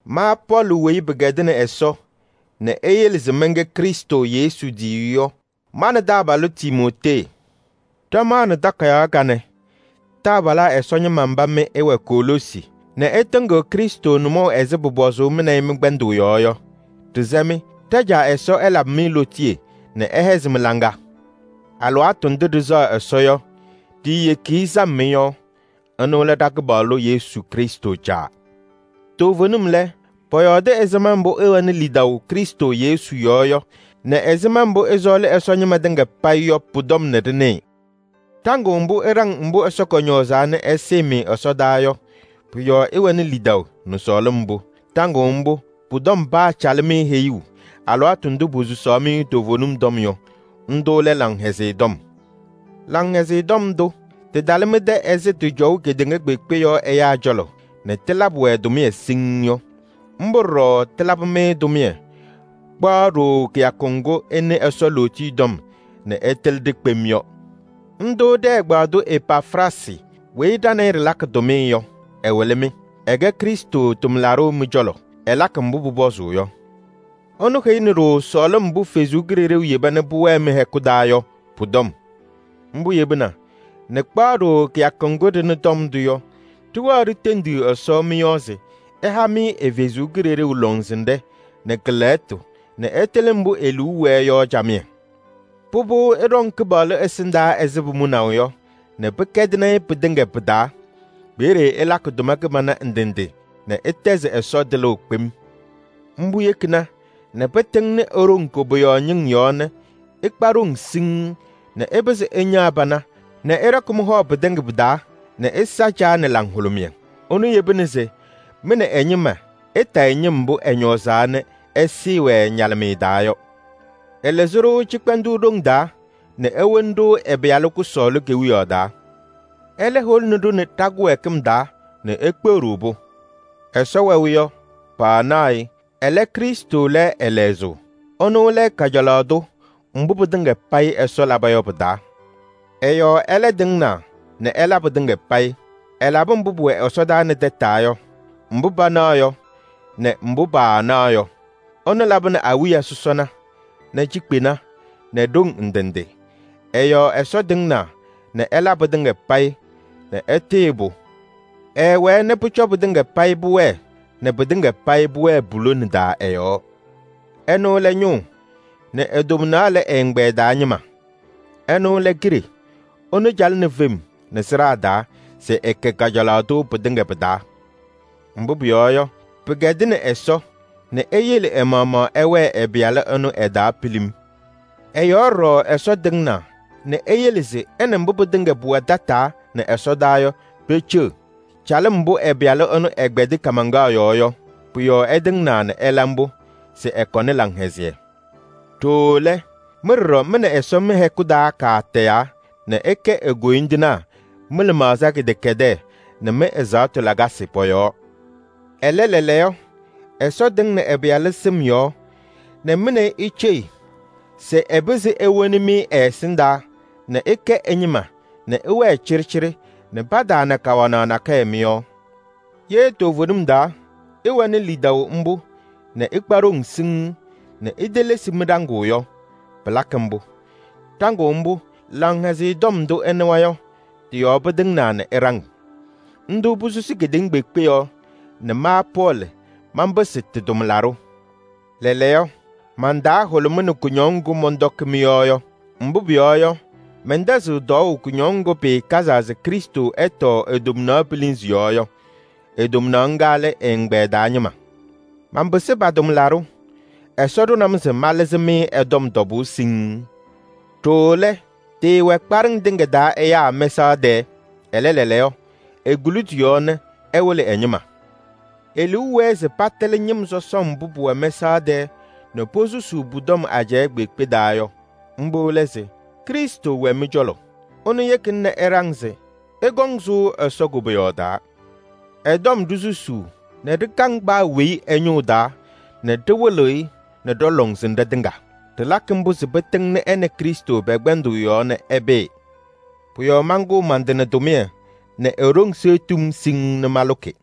Ma Pɔɔlɩ weyi pɩkɛdɩnɩ Ɛsɔ nɛ eyele se mɛnkɛ Krɩstʋ Yesu tiyiyu yɔ, ma nɛ taabalʋ Timootee ɖɩmaɣnɩ takayaɣ kanɛ taabalaa Ɛsɔ ñɩma mba mɩ ɩwɛ Koloosi nɛ ɩtɩŋɩɣ Krɩstʋ nʋmɔʋ ɛzɩ pʋpɔzʋʋ mɩ nɛ ɩ mɩ-kpɛndʋʋ yɔɔ yɔ. Ɖɩsɛ-mɩ: ɖa-Caa Ɛsɔ ɛlabɩ-mɩ lootiye nɛ ɛhɛzɩ mɩ-laŋa! Alɩwaatʋ ndʋ ɖɩsɛɣ Ɛsɔ yɔ, ɖiiyeki-i sam mɩ-yɔɔ. Ɛnʋ lɛ ɖa-Kɩpaɣlʋ Yesu Krɩstʋ Caa. Toovenim lɛ, pɔyɔɔdɩ ɛzɩma mbʋ ɩwɛnɩ lidaʋ Krɩstʋ Yesu yɔɔ yɔ nɛ ɛzɩma mbʋ ɩsɔɔlɩ Ɛsɔ ñɩma tɩŋa payɩ yɔ pʋ-tɔm nɛ ɖɩnɩɩ. Ɖaŋʋʋ mbʋ ɩɖaŋ mbʋ Ɛsɔ kɔñɔɔzaa nɛ ɛsɩɩ-mɩ ɛsɔdaa yɔ, pʋ-yɔɔ ɩwɛnɩ lidaʋ nɛ sɔɔlɩm mbʋ. Ɖaŋʋʋ mbʋ, pʋ-tɔm paacalɩ-mɩ heyuu alɩwaatʋ ndʋ posusaɣ-mɩ toovenim tɔm yɔ. Ndʋ lɛ Laŋhɛzɩyɛ Tɔm. Laŋhɛzɩyɛ Tɔm ndʋ tɩtalɩ mɩ-tɛ ɛzɩ tɩcɔʋ kedeŋa kpeekpe yɔɔ ɛyaa cɔlɔ nɛ tɩlabɩ-wɛ tʋmɩyɛ siŋŋ yɔ. Mbʋ ɖɔɖɔ tɩlabɩ-mɩ tʋmɩyɛ kpaɣ ɖooo kɩyakʋ ŋgʋ ɩnɩ Ɛsɔ lootiye tɔm nɛ ɩtɩlɩ-ɖɩ kpem yɔ. Ndʋ ɖɛ-ɛgbaadʋ Epafraasɩ weyi ɖa nɛ ɩ ɖɩlakɩ tʋmɩyɛ yɔ, ɛwɩlɩ-mɩ. Ɛkɛ Krɩstʋ tʋmlaɖʋ mɩ-cɔlɔ, ɛlakɩ mbʋ pʋpɔzʋʋ yɔ. Ɛnʋ heyini-ɖʋ sɔɔlɩm mbʋ Ɛsɔ Kalɩzaɣ yeba nɛ pʋwɛɛ mɩ-hɛkʋ taa yɔ pʋ-tɔm. Mbʋ yebina nɛ kpaɣ ɖooo kɩyakʋ ŋgʋ ɖɩnɩ tɔm ndʋ yɔ, ɖɩwɛɛ ɖitendiɣ Ɛsɔ mɩ-yɔɔ se ɛha-mɩ ɛ-Kalɩzaɣ lɔŋsɩnɖɛ nɛ kɛ-lɛɣtʋ nɛ ɩtɩlɩ mbʋ e-liu wɛɛ yɔ camɩyɛ. Pʋbʋ, ɩɖɔŋ Kɩpaɣlʋ ɛsɩndaa ɛzɩ pʋmʋnaʋ yɔ nɛ pɩkɛdɩnɩ-ɩ pɩtɩŋa pɩ-taa. Peeye ɩlakɩ tʋma kɩbana ndɩ ndɩ nɛ ɩtɛzɩ Ɛsɔ tɩlʋʋ kpem. Mbʋ yekina nɛ pɩtɩŋnɩ e-ɖoŋ koboyaɣ ñɩŋ yɔɔ nɛ ɩkpa ɖoŋ siŋŋ nɛ ɩpɩzɩ ɩñaɣ pana nɛ ɩɖɔkɩ mɩ-hɔ pɩtɩŋa pɩ-taa nɛ ɩsa Caa nɛ laŋhʋlʋmɩyɛ. Ɛnʋ yebina se mɩ nɛ ɛ-ñɩma ɩtayɩ ñɩm mbʋ ɛñɔɔzaa nɛ ɛsɩɩ-wɛ ñalɩmɩyɛ taa yɔ. Ɛlɩzɩ-ɖʋ cɩkpɛndʋʋ ɖoŋ taa nɛ ewoni-ɖʋ ɛ-Pɩyalʋ kʋsɔɔlʋ kewiyaɣ taa. Ɛlɛ holini-ɖʋ nɛ ɖa-kɩwɛɛkɩm taa nɛ ekpeɣ-ɖʋ-pʋ. Ɛsɔ wɛʋ yɔ, paanaɣ-ɩ, ɛlɛ, Krɩstʋ lɛ ɛ-lɛzʋʋ. Ɛnʋ lɛ kajalaɣ tʋ mbʋ pɩtɩŋa payɩ Ɛsɔ laba yɔ pɩ-taa. Ɛ-yɔɔ ɛlɛ tɩŋnaa nɛ ɛla pɩtɩŋa payɩ. Ɛlabɩ mbʋ pʋwɛ ɛsɔdaa nɛ tataa yɔ, mbʋ panaɣ yɔ nɛ mbʋ paanaɣ yɔ. Ɛnʋ labɩnɩ awiya sɔsɔna nɛ cikpena nɛ ɖoŋ ndɩ ndɩ. Ɛ-yɔɔ Ɛsɔ tɩŋnaa nɛ ɛla pɩtɩŋa payɩ nɛ ɛtɩɣyɩ-pʋ. Ɛɛwɛɛ nɛ pʋcɔ pɩtɩŋa payɩ pʋwɛɛ nɛ pɩtɩŋa payɩ pʋwɛɛ pu-lona taa ɛ-yɔɔ. Ɛnʋ lɛ ñʋʋ nɛ e-tomnaɣ lɛ ɛ-ɛgbɛyɛ taa ñɩma. Ɛnʋ lɛ kiɖe, ɛnʋ calɩnɩ fem nɛ sɩɖaa taa se ɛkɛ kajalaɣ tʋ pɩtɩŋa pɩ-taa. Mbʋ pʋyɔɔ yɔ, pɩkɛdɩnɩ Ɛsɔ nɛ eyele ɛ-maɣmaɣ ɛwɛɛ ɛ-Pɩyalʋ ɛnʋ ɛ-taa pilim. Ɛ-yɔɔ ɖɔɖɔ Ɛsɔ tɩŋnaa nɛ eyele se ɛ nɛ mbʋ pɩtɩŋa pʋwɛ tataa nɛ ɛsɔdaa yɔ, peceɣ. Calɩm mbʋ ɛ-Pɩyalʋ ɛnʋ ɛkpɛdɩ kaamaŋkaɣ yɔɔ yɔ, pʋ-yɔɔ ɛtɩŋnaa nɛ ɛla mbʋ nɛ ɛkɔnɩ laŋhɛzɩyɛ. Ɖooo lɛ, mɩ ɖɔɖɔ mɩ nɛ Ɛsɔ mɩ-hɛkʋ taa katayaa nɛ ɩkɛ e-koyindinaa mɩ-lɩmaɣza kɩdɛkɛdɛɛ nɛ mɩ-ɛzaɣtʋ lakasɩ pɔ-yɔɔ. Ɛlɛ, lɛɛlɛɛyɔ Ɛsɔ tɩŋnɩ ɛ-Pɩyalʋ sɩm yɔɔ nɛ mɩ nɛ ɩ iceɣ se ɛpɩzɩ ewoni-mɩ ɛ-ɛsɩndaa nɛ ɩkɛ ɛ-ñɩma nɛ ɩwɛɛ cɩɖɩcɩɖɩ nɛ pataana kawanaɣ nakɛyɛ mɩ-yɔɔ. Ye toovenim taa ɩwɛnɩ lidaʋ mbʋ nɛ ɩkpa ɖoŋ siŋŋ nɛ itelesi mɩ-ɖaŋʋʋ yɔ, pɩlakɩ mbʋ. Ɖaŋʋʋ mbʋ, Laŋhɛzɩyɛ Tɔm ndʋ ɩnɩwa yɔ, tɩ-yɔɔ pɩtɩŋnaa nɛ ɩɖaŋ. Ndʋ posusi kedeŋa kpeekpe yɔɔ nɛ ma Pɔɔlɩ manpɩsɩ tɩ-tʋmlaɖʋ. Lɛɛlɛɛyɔ, man-taa hʋlʋmɩnɩ kʋñɔŋ ŋgʋ mɔntɔkɩ mɩ-yɔɔ yɔ. Mbʋ pʋyɔɔ yɔ, mɛntɛzɩɣ tɔɔʋ kʋñɔŋ ŋgʋ pɩɩkazaa se Krɩstʋ ɛtɔɔ e-tomnaɣ pilinzi yɔɔ yɔ. Ŋga lɛ ɛ-ɛgbɛyɛ taa ñɩma. Manpɩsɩ pa-tʋmlaɖʋ: Ɛsɔ ɖʋnɩ-m se malɩzɩ-mɩ ɛ-tɔm tɔbʋʋ siŋŋ. Ɖooo lɛ, tɩɩwɛ kpaɖɩŋ tɩŋa taa ɛyaa mɛsaɣ tɛɛ, ɛlɛ lɛɛlɛɛyɔ, ekuli tɩ-yɔɔ nɛ ɛwɩlɩ ɛ-ñɩma. E-liu wɛɛ se patɩlɩ ñɩm sɔsɔm mbʋ pʋwɛ mɛsaɣ tɛɛ nɛ posusuu pʋ-tɔm ajɛɛ kpeekpe taa yɔ. Mbʋ lɛ se: Krɩstʋ wɛ mɩ-cɔlɔ. Ɛnʋ yekina nɛ ɩɖaŋ se ɩkɔŋ sʋʋ Ɛsɔ koboyaɣ taa. Ɛ-tɔm ɖisusuu nɛ ɖɩkaŋ paa weyi ɛ-ñʋʋ taa nɛ ɖɩwɩlɩɣ-ɩ nɛ ɖɔ-lɔŋsɩnɖɛ tɩŋa. Ɖɩlakɩ mbʋ se pɩtɩŋnɩ ɛ nɛ Krɩstʋ pɛ-kpɛndʋʋ yɔɔ nɛ ɛpɩɩ. Pʋ-yɔɔ mankʋʋ man-tɩ nɛ tʋmɩyɛ nɛ e-ɖoŋ seɣtiɣ-m siŋŋ nɛ malʋkɩ.